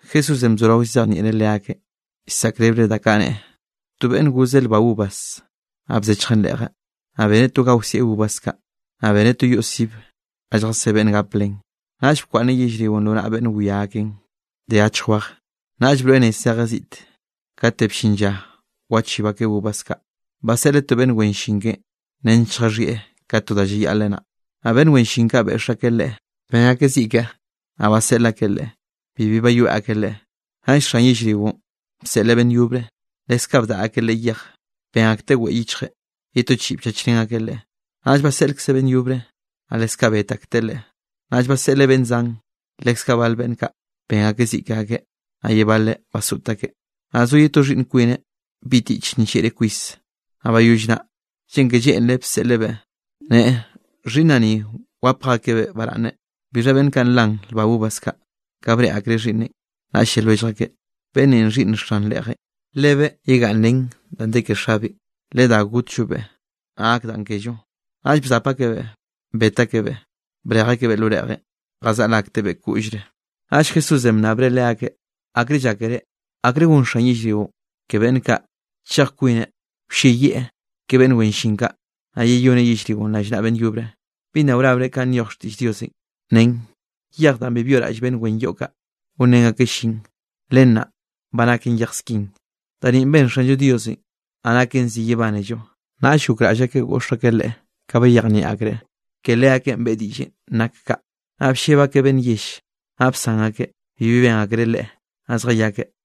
Jesúsenꞌ bzorao llzejnieꞌreꞌ leakeꞌ, llsaꞌkrebreꞌ da kaꞌ neꞌe: —To beꞌnn gozeꞌ lba uvas, naꞌ bzechjeꞌn reꞌje, naꞌ beneꞌ to ga wsieꞌ uvas kaꞌ, naꞌ beneꞌ to yoꞌ sib ga lljasé beꞌnn gap len. ’Naꞌll bkwaꞌnneꞌ yellrionꞌ lo naꞌa beꞌnn wia akeꞌn de achj wej, naꞌll broeꞌ nez zejeꞌ ziꞌte. Kate bllin lla wachib akeꞌ uvas kaꞌ, baseꞌleꞌ to beꞌnn wen llin keꞌen nench lljaxhieꞌ ka to da llayaꞌleꞌ naꞌ. Naꞌ beꞌnn wen llin kaꞌ beꞌx akeꞌ leꞌe, ben akeꞌ ziꞌ keꞌe, naꞌ baseꞌl akeꞌ leꞌe bibi bayoeꞌ akeꞌ leꞌe. Naꞌll xan yellrionꞌ bseꞌleꞌ beꞌnn yobre; leskaꞌ bdaꞌa akeꞌ leꞌe yej, ben akteꞌ weꞌe yichjeꞌ, ye to chiꞌi bchachrén akeꞌ leꞌe. Naꞌll baseꞌlkzeꞌ beꞌnn yobre, naꞌ leskaꞌ bet akteꞌ leꞌe. Naꞌll baseꞌleꞌ beꞌnn zan, leskaꞌ bal beꞌnn kaꞌ ben akeꞌ ziꞌ ke akeꞌ, naꞌ ye baleꞌ basoꞌt akeꞌ. ’Naꞌ zo ye to xhiꞌnn kwineꞌ bi tiꞌche nllieꞌreꞌ kwis, naꞌ bayoll naꞌ, lleꞌn ke lleꞌnreꞌ bseꞌlebeꞌ neꞌe: “Xhiꞌnnaꞌ ni wap akjebeꞌ baraꞌnne.” Bixha beꞌnn kaꞌ nlan lba uvas kaꞌ, ka breꞌe akreꞌ xhiꞌnneꞌn, naꞌll lle lwellj akeꞌ: “Beꞌnn ninꞌ xhiꞌnn xan reꞌjenꞌ, lebeꞌ yegaꞌnn ren danꞌ de ke xabeꞌn, ledá gotllobeꞌ naꞌ gak danꞌ kello.” Naꞌll bzap akebeꞌ, bet akebeꞌ, brej akebeꞌ lo reꞌjenꞌ jazaꞌl aktebeꞌ koꞌllre. Naꞌll Jesúsenꞌ bnnabreꞌ leakeꞌ: —¿Akre ka llákere? ¿Akre gon xan yellrionꞌ ke beꞌnn kaꞌ? Chej kwineꞌ wlleyieꞌ ke beꞌnn wen llin kaꞌ, naꞌ yeyoneꞌ yellrionꞌ rallnaꞌa beꞌnn yobre. ’¿Bi nna wrabre kanꞌ nyoj xtiꞌll Diosenꞌ? Nen: Yej danꞌ bi byoꞌraꞌll beꞌnn wen yoꞌ kaꞌ, gonrén akeꞌ llin, len naꞌ ba naken yej skin. Da ni ben Xanllo Diosenꞌ, naꞌ naken zi yebánello. Naꞌll gokraꞌll akeꞌ goꞌx akeꞌ Leꞌe, ka bayejnieꞌ akreꞌ ke leakeꞌn beꞌe diꞌllenꞌ nak kaꞌ; naꞌ blleb akeꞌ beꞌnn yell, naꞌ bsan akeꞌ bibi ben akreꞌ Leꞌe, naꞌ zjayakeꞌ.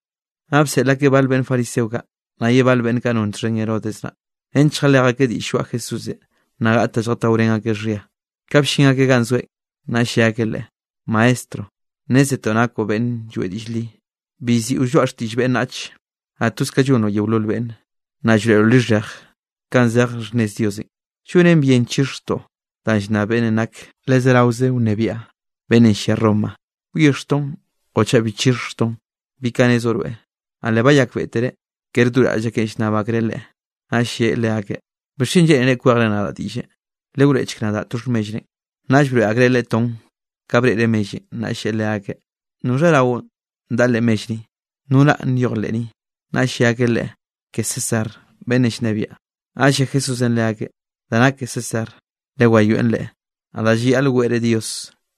Naꞌ bseꞌl akeꞌ bal beꞌnn fariseo kaꞌ, naꞌ ye bal beꞌnn kaꞌ non txhen Herodes naꞌ, nench lljalej akeꞌ diꞌll lloaꞌ Jesúsenꞌ, naꞌ gaꞌt da lljataorén akeꞌ xhia. Ka bllin akeꞌ ganꞌ zoeꞌn, naꞌll lle akeꞌ Leꞌe: —Maestro, nnézetoꞌ nakoꞌ beꞌnn lloeꞌ diꞌll li, bi llziꞌo lloaꞌ xtiꞌll beꞌnnach, naꞌ toz ka llonroꞌ yeolol beꞌnne, naꞌ llroeꞌroꞌ lixhej kanꞌ zej xhnnez Diosenꞌ. ¿Llonen bien chixhjtoꞌ da llnnab beꞌnnenꞌ nak le zeraoze wnebiaꞌ, beꞌnnenꞌ llia Roma? ¿Wyixhjtoꞌn o chaꞌ bi chixhjtoꞌn? ¿Bi ka nezoꞌ rweꞌ? Naꞌ le bayakbeꞌtereꞌ kere do raꞌll akeꞌn llnnab akreꞌ Leꞌe, naꞌll lleꞌe leakeꞌ: —¿Bixchen lleꞌnere kwejre nadaꞌ diꞌlle? Lewroeꞌchk nadaꞌ to xhmellrenꞌ. Naꞌll broeꞌ akreꞌ Leꞌe ton, ka breꞌreꞌ mellenꞌ, naꞌll lleꞌe leakeꞌ: —¿Noxha raonꞌ daꞌa leꞌ mell ni? ¿No ranꞌ nyoj leꞌ ni? Naꞌll lle akeꞌ Leꞌe: —Ke César, beꞌnnenꞌ llnebiaꞌn. Naꞌll lle Jesúsenꞌ leakeꞌ: —Da nak ke César lewayoeꞌn leꞌe; naꞌ da llayaꞌl weꞌre Dios,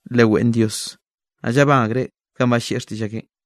leweꞌn Dios. Naꞌ llabán akreꞌ kanꞌ ballieꞌ xtiꞌll akeꞌn.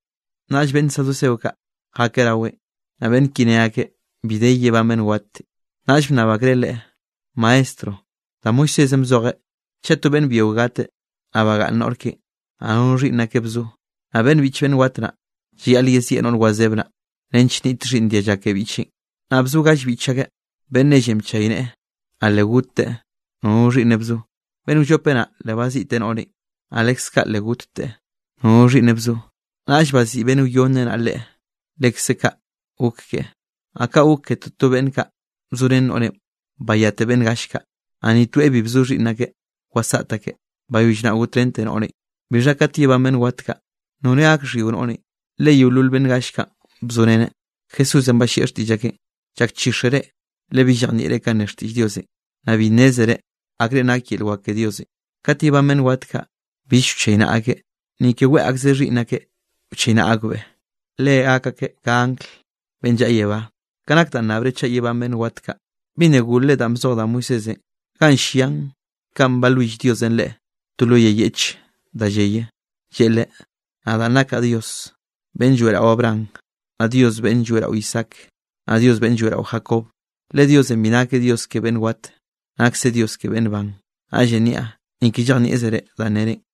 Naꞌll beꞌnn saduceo kaꞌ jakeꞌ raweꞌn. Naꞌ beꞌnn ki ne akeꞌ bi de yebán beꞌnn watenꞌ, naꞌll bnnab akreꞌ Leꞌe: —Maestro, da Moisésenꞌ bzojeꞌ chaꞌ to beꞌnn byio gateꞌ, naꞌ bagaꞌnn noꞌr keꞌe, naꞌ nono xhiꞌnn akeꞌ bzo, naꞌ beꞌnn biꞌch beꞌnn wat naꞌ, llayaꞌl yezieꞌ noꞌr wazeb naꞌ, nench nniꞌt xhiꞌnn dialla ke biꞌcheꞌn. Naꞌ bzo gall biꞌch ake, beꞌnn nelle bchayneꞌe, naꞌ le gotteꞌ nono xhiꞌnneꞌ bzo. Beꞌnn wllope naꞌ, le baziꞌteꞌ noꞌrenꞌ, naꞌ leskaꞌ le gotteꞌ nono xhiꞌnneꞌ bzo. Naꞌll baziꞌi beꞌnn wyonne naꞌ leꞌe, lekze kaꞌ gok keꞌe. Naꞌ kaꞌ gok ke toto beꞌnn kaꞌ bzorén noꞌrenꞌ bayate beꞌnn gall kaꞌ, naꞌ ni toeꞌ bi bzo xhiꞌnn akeꞌ wasaꞌt akeꞌ, bayoll naꞌ gotrén noꞌrenꞌ. Bixha kat yebán beꞌnn wat kaꞌ, ¿noreꞌ gak xhyio noꞌrenꞌ, le yeolol beꞌnn gall kaꞌn bzoreneꞌ? Jesúsenꞌ ballieꞌ xtiꞌll akeꞌn: —Llakchíxere le bi llejnieꞌre kanꞌ ne xtiꞌll Diosenꞌ, naꞌ bi nnézere akrenꞌ nake yel wak ke Diosenꞌ. Kat yebán beꞌnn wat kaꞌ, bill wchaynaꞌa akeꞌ, ni ke weꞌe akzeꞌ xhiꞌnn akeꞌ wchaynaꞌa akbeꞌ, le gak akeꞌ ka angl beꞌnn llaꞌa yebá. Ka nak danꞌ nnabre chaꞌ yebán beꞌnn wat kaꞌ, ¿bi nna golre danꞌ bzoj da Moisésenꞌ ganꞌ llian kanꞌ balwill Diosenꞌ leꞌe to lo yay yeꞌche da lleye? Lleꞌe leꞌe: “Nadaꞌ nakaꞌ Dios beꞌnn lloeꞌrao Abraham, naꞌ Dios beꞌnn lloeꞌrao Isaac, naꞌ Dios beꞌnn lloeꞌrao Jacob.” Le Diosenꞌ bi nakeꞌ Dios ke beꞌnn wat, nakseꞌ Dios ke beꞌnn ban. Naꞌllenꞌ niaꞌ, ni ke llejnieꞌzere danꞌ nerenꞌ.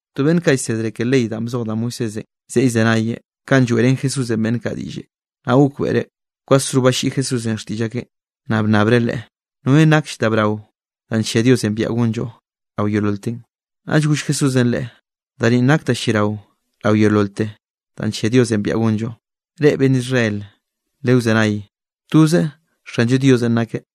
To beꞌnn kaꞌ llsedre ke ley danꞌ bzoj da Moisésenꞌ zeꞌe llzenayeꞌ ka lloeꞌrén Jesúsenꞌ beꞌnn kaꞌ diꞌlle, naꞌ gokbeꞌreꞌ kwasro balliꞌi Jesúsenꞌ xtiꞌll akeꞌn, naꞌ bnnabreꞌ Leꞌe: —¿Norenꞌ nakll da brao danꞌ nllia Diosenꞌ biaꞌa gonllo rao yeololten? Naꞌll goll Jesúsenꞌ leꞌe: —Da ninꞌ da nak da lliarao rao yeololte danꞌ nllia Diosenꞌ biaꞌa gonllo: “Reꞌ beꞌnn Israel, lewzenay, toze Xanllo Diosenꞌ nakeꞌ.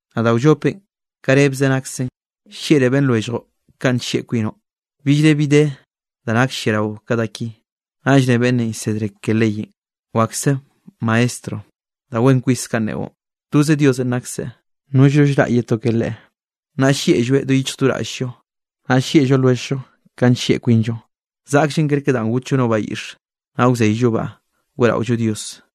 Naꞌ da wllopenꞌ ka rebze naksen: “Llieꞌroꞌ beꞌnn lwelljoꞌ kanꞌ nllieꞌ kwinoꞌ.” Billre bi de da nakll lliarao ka da ki. Naꞌll ne beꞌnnenꞌ llsedre ke leyenꞌ: —Wakse, maestro, da wen kwis kanꞌ neꞌon. Toze Diosenꞌ nakse, nollno llraꞌ ye to ka Leꞌe. Naꞌ llieꞌlloeꞌ do yichj do raꞌll-llo, naꞌ llieꞌllo lwelljllo ka nllieꞌ kwinllo, zaꞌkllen kerke da gotllo no bayiꞌx, naꞌ wzeyllobaꞌ weꞌraollo Dios.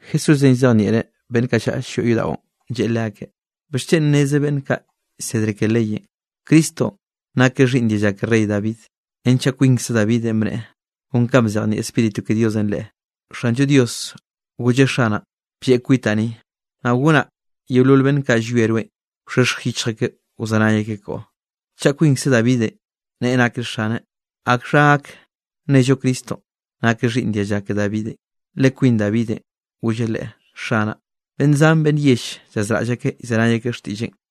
Jesúsenꞌ llzejnieꞌreꞌ beꞌnn kaꞌ llaꞌa llyoꞌ yodaꞌon, lleꞌe leakeꞌ: —¿Bixchen neze beꞌnn kaꞌ llsedre ke leyenꞌ, Cristonꞌ nakeꞌ xhiꞌnn dialla ke rey David? Renchaꞌ kwinkze Davidenꞌ bneꞌe kon ka bzejnieꞌ Spíritu ke Diosenꞌ leꞌe: Xanllo Dios golleꞌ Xanaꞌn: “Blleꞌ kwitaꞌn ni, naꞌ gonaꞌ yeolol beꞌnn kaꞌ llwieꞌ rweꞌn, wxhexj yichj akeꞌ wzenay akeꞌ koꞌo.” Chaꞌ kwinkze Davidenꞌ neꞌe nakeꞌ Xaneꞌ, ¿akxha gak nello Cristonꞌ nakeꞌ xhiꞌnn dialla ke Davidenꞌ? Le kwin Davidenꞌ golleꞌ leꞌe: “Xanaꞌ.” Beꞌnn zan beꞌnn yell llazraꞌll akeꞌ llzenay akeꞌ xtiꞌlleꞌn.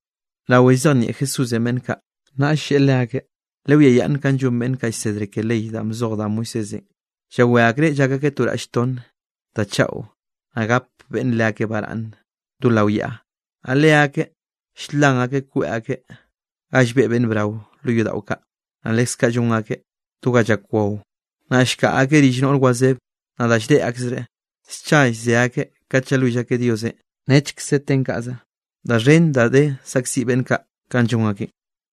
Rawe llzejnieꞌ Jesúsenꞌ beꞌnn kaꞌ, naꞌll lleꞌe leakeꞌ: —Lewiayaꞌnn kanꞌ llon beꞌnn kaꞌ llsedre ke ley danꞌ bzoj da Moisésenꞌ, llawé akreꞌ llak akeꞌ to raꞌll tonne da chaꞌo, naꞌ gap beꞌnne leakeꞌ baraꞌnne do lao yaꞌa. Naꞌ leakeꞌ ll-lan akeꞌ kweꞌ akeꞌ ga llbeꞌ beꞌnn brao lo yodaꞌo kaꞌ, naꞌ leskaꞌ llon akeꞌ do ga llak wao. Naꞌ llkaꞌa akeꞌ rill noꞌr wazebe, naꞌ da lldeꞌ akreꞌ, scha llze akeꞌ kate llalwill akeꞌ Diosenꞌ nechkze ten kaꞌze. Da xhen da de saꞌkziꞌ beꞌnn kaꞌ kanꞌ llon akeꞌn.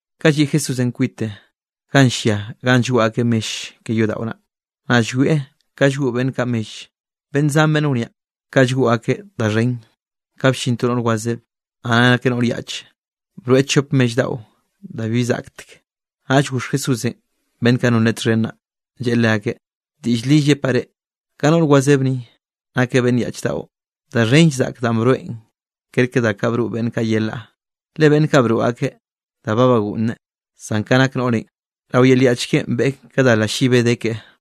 Ka lliꞌ Jesúsenꞌ kwite ga llia ganꞌ llgoꞌ akeꞌ mell ke yodaꞌon, naꞌ llwieꞌ ka llgoꞌ beꞌnn kaꞌ mell, beꞌnn zan beꞌnn wniaꞌ kaꞌ llgoꞌ akeꞌ da xhen. Ka bllin to noꞌr wazebe, naꞌ nakeꞌ noꞌr yaꞌche, broeꞌ chop mell daꞌo da bibi zaꞌktek. Naꞌll goxh Jesúsenꞌ beꞌnn kaꞌ non Leꞌen txhen naꞌ, lleꞌe leakeꞌ: —Diꞌll li llepaꞌ reꞌ, ka noꞌr wazeb ni, nakeꞌ beꞌnn yaꞌch daꞌo, da xhenll zaꞌk danꞌ broeꞌn kerke da broꞌ beꞌnn kaꞌ yelaꞌ. Le beꞌnn kaꞌ broꞌ akeꞌ da ba bagoꞌnne, zan ka nak noꞌrenꞌ, rao yel yaꞌch keꞌen beꞌe ka da lallibe de keꞌe.